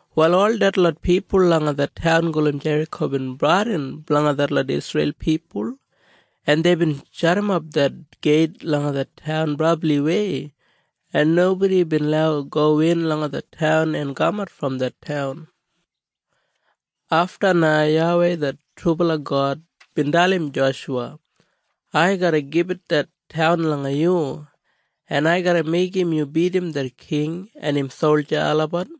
Wal ol detlot pipul langa det taun gulum Jeriko bin bradin blanga detlot Isreil pipul, en deibin jadimap det geit langa det taun brabliwei, en nobodi bin lau gowin langa det taun en kamat brom det taun. Afta na YAWEI det trubala God bin dalim Joshuwa, “Ai garra gibit det taun langa yu, en ai garra meigim yu bidim det king en im solja olabat.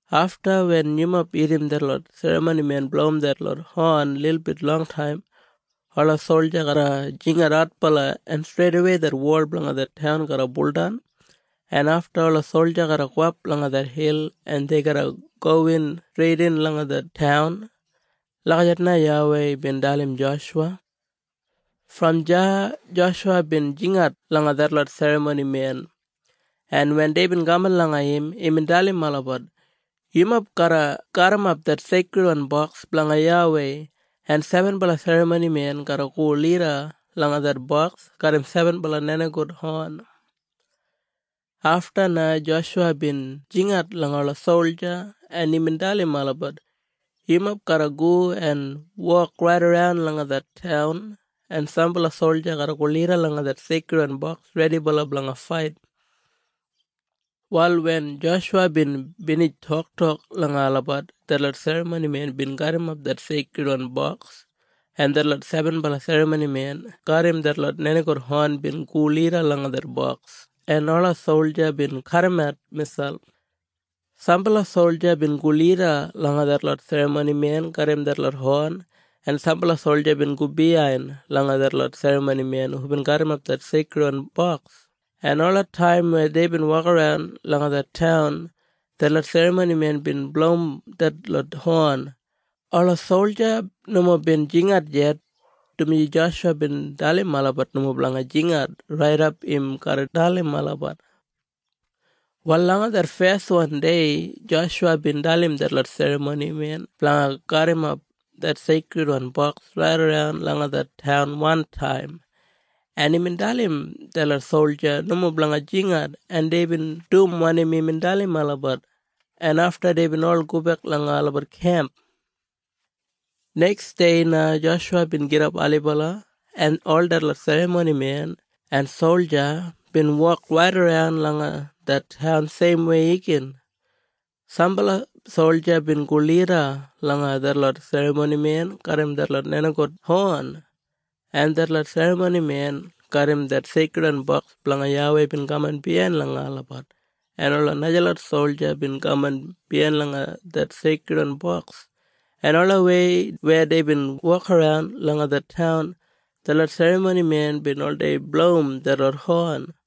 Afta wen yumob irrim detlot serramonimen blowim detlot hon lilbit longtaim, ola solja garra jingat adbala, en streidawei det wol blanga det taun garra buldan, en afta ola solja garra gowap langa det hil, en dei garra gowin streidin langa det taun.” Lagijat na YAWEI bin dalim Joshuwa. Brom deya Joshuwa bin jingat langa detlot serramonimen, en wen deibin kaman langa im, imbin dalim olabat, “Yumob garra garrimap det Seikridwan Boks blanga YAWEI, en sebenbala serramonimen garra go lida langa det boks garram sebenbala nenigout hon.” Afta na Joshuwa bin jingat langa ola solja, en imbin dalim olabat, “Yumob garra go en wok raidaran langa det taun, en sambala solja garra go lida langa det Seikridwan Boks redibala blanga fait.” Wal wen Joshuwa bin binij toktok langa olabat, detlot serramonimen bin garrimap det Seikridwan Boks, en detlot sebenbala serramonimen garram detlot nenigout hon bin go lida langa det boks, en ola solja bin kadimat miselp. Sambala solja bin go lida langa detlot serramonimen garram detlot hon, en sambala solja bin go biyain langa detlot serramonimen hubin garrimap det Seikridwan Boks, en olataim weya deibin wokaran langa det taun, detlot serramonimen bin blowim detlot hon. Ola solja nomo bin jingat yet, dumaji Joshuwa bin dalim olabat nomo blanga jingat raidap im garra dalim olabat. Wal langa det feswan dei, Joshuwa bin dalim detlot serramonimen blanga garrimap det Seikridwan Boks raidaran langa det taun wantaim, en imbin dalim detlot solja nomo blanga jingat, en deibin dum wanim imbin dalim olabat, en afta deibin ol gobek langa olabat kemp. Neksdei na Joshuwa bin gidap ailibala, en ol detlot serramonimen en solja bin wok raidaran langa det taun seimwei igin. Sambala solja bin go lida langa detlot serramonimen garram detlot nenigout hon, en detlot serramonimen garram det Seikridwan Boks blanga YAWEI bin kaman biyain langa olabat, en ola najalot solja bin kaman biyain langa det Seikridwan Boks, en olawei weya deibin wokaran langa det taun, detlot serramonimen bin oldei blowim detlot hon.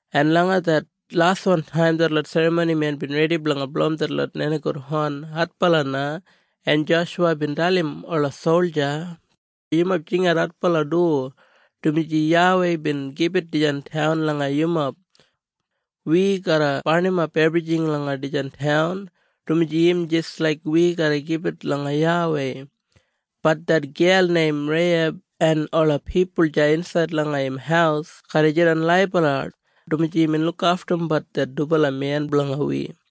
en langa det laswan taim, detlot serramonimen bin redi blanga blowim detlot nenigout hon adbala na, en Joshuwa bin dalim ola solja, “Yumob jingat adbala du, dumaji YAWEI bin gibit dijan taun langa yumob! Wi garra barnimap ebrijing langa dijan taun, dumaji im jis laik wi garra gibit langa YAWEI. Bat det gel neim Reiheb en ola pipul deya insaid langa im haus garra jidan laibala, dumaji imbin lukaftum det dubala men blanga wi.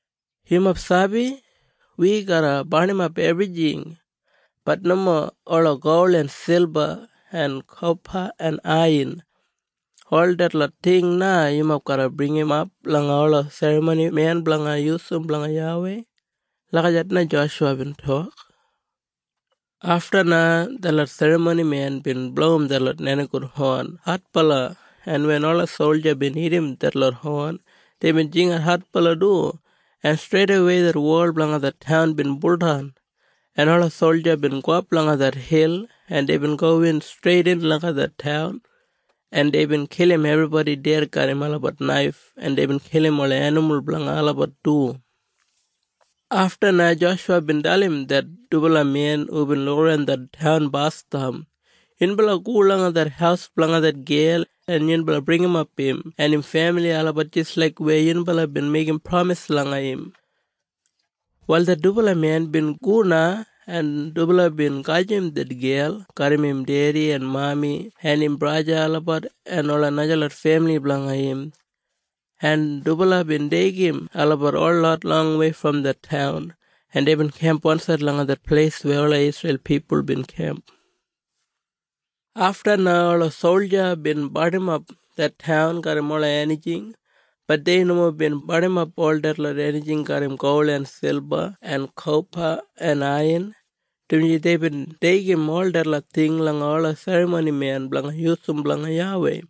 Yumob sabi? Wi garra barnimap ebrijing. Bat nomo ola gol en silba en kopa en aiyan. Ol detlot ting na yumob garra bringimap langa ola serramonimen blanga yusum blanga YAWEI.” Lagijat na Joshuwa bin tok. Afta na detlot serramonimen bin blowim detlot nenigout hon adbala, en wen ola solja bin irrim detlot hon, deibin jingat adbala du, en streidawei det wol blanga det taun bin buldan, en ola solja bin gowap langa det hil, en deibin gowin streidin langa det taun, en deibin kilim ebribodi ded garram olabat naif, en deibin kilim ola enimul blanga olabat du. Afta na Joshuwa bin dalim det dubala men hubin lukaran det taun basdam, “Yunbala go langa det haus blanga det gel, en yunbala bringimap im en im femili olabat jis laik weya yunbala bin meigim pramis langa im.” Wal det dubala men bin go na, en dubala bin gajim det gel garram im dedi en im mami en im braja olabat en ola najalot femili blanga im, en dubala bin deigim olabat holot longwei brom det taun, en deibin kemp wansaid langa det pleis weya ola Isreil pipul bin kemp. Afta na ola solja bin barnimap det taun garram ola enijing. Bat dei nomo bin barnimap ol detlot enijing garram gol en silba en kopa en aiyan, dumaji deibin deigim ol detlot ting langa ola serramonimen blanga yusum blanga YAWEI.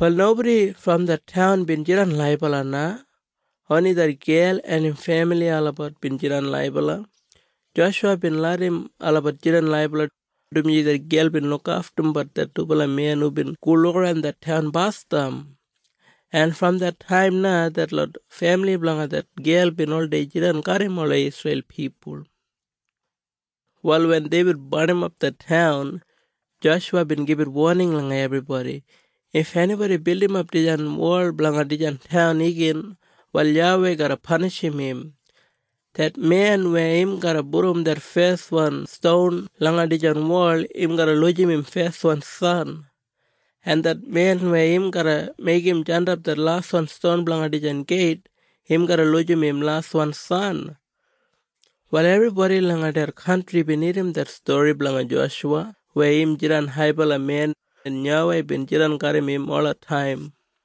Wal nobodi brom det taun bin jidan laibala na. Oni det gel en im femili olabat bin jidan laibala. Joshuwa bin larram olabat jidan laibala, dumaji det gel bin lukaftum det dubala men hubin go lukaran det taun basdam. En brom det taim na detlot femili blanga det gel bin oldei jidan garram ola Isreil pipul. Wal wen deibin barnimap det taun, Joshuwa bin gibit woning langa ebribodi, “If enibodi bildimap dijan wol blanga dijan taun igin, wal YAWEI garra panishim im. Det men weya im garra pudum det feswan ston langa dijan wol, im garra lujim im feswan san. En det men weya im garra meigim jandap det laswan ston blanga dijan geit, im garra lujim im laswan san.” Wal ebribodi langa det kantri bin irrim det stori blanga Joshuwa weya im jidan haibala men, en YAWEI bin jidan garram im olataim.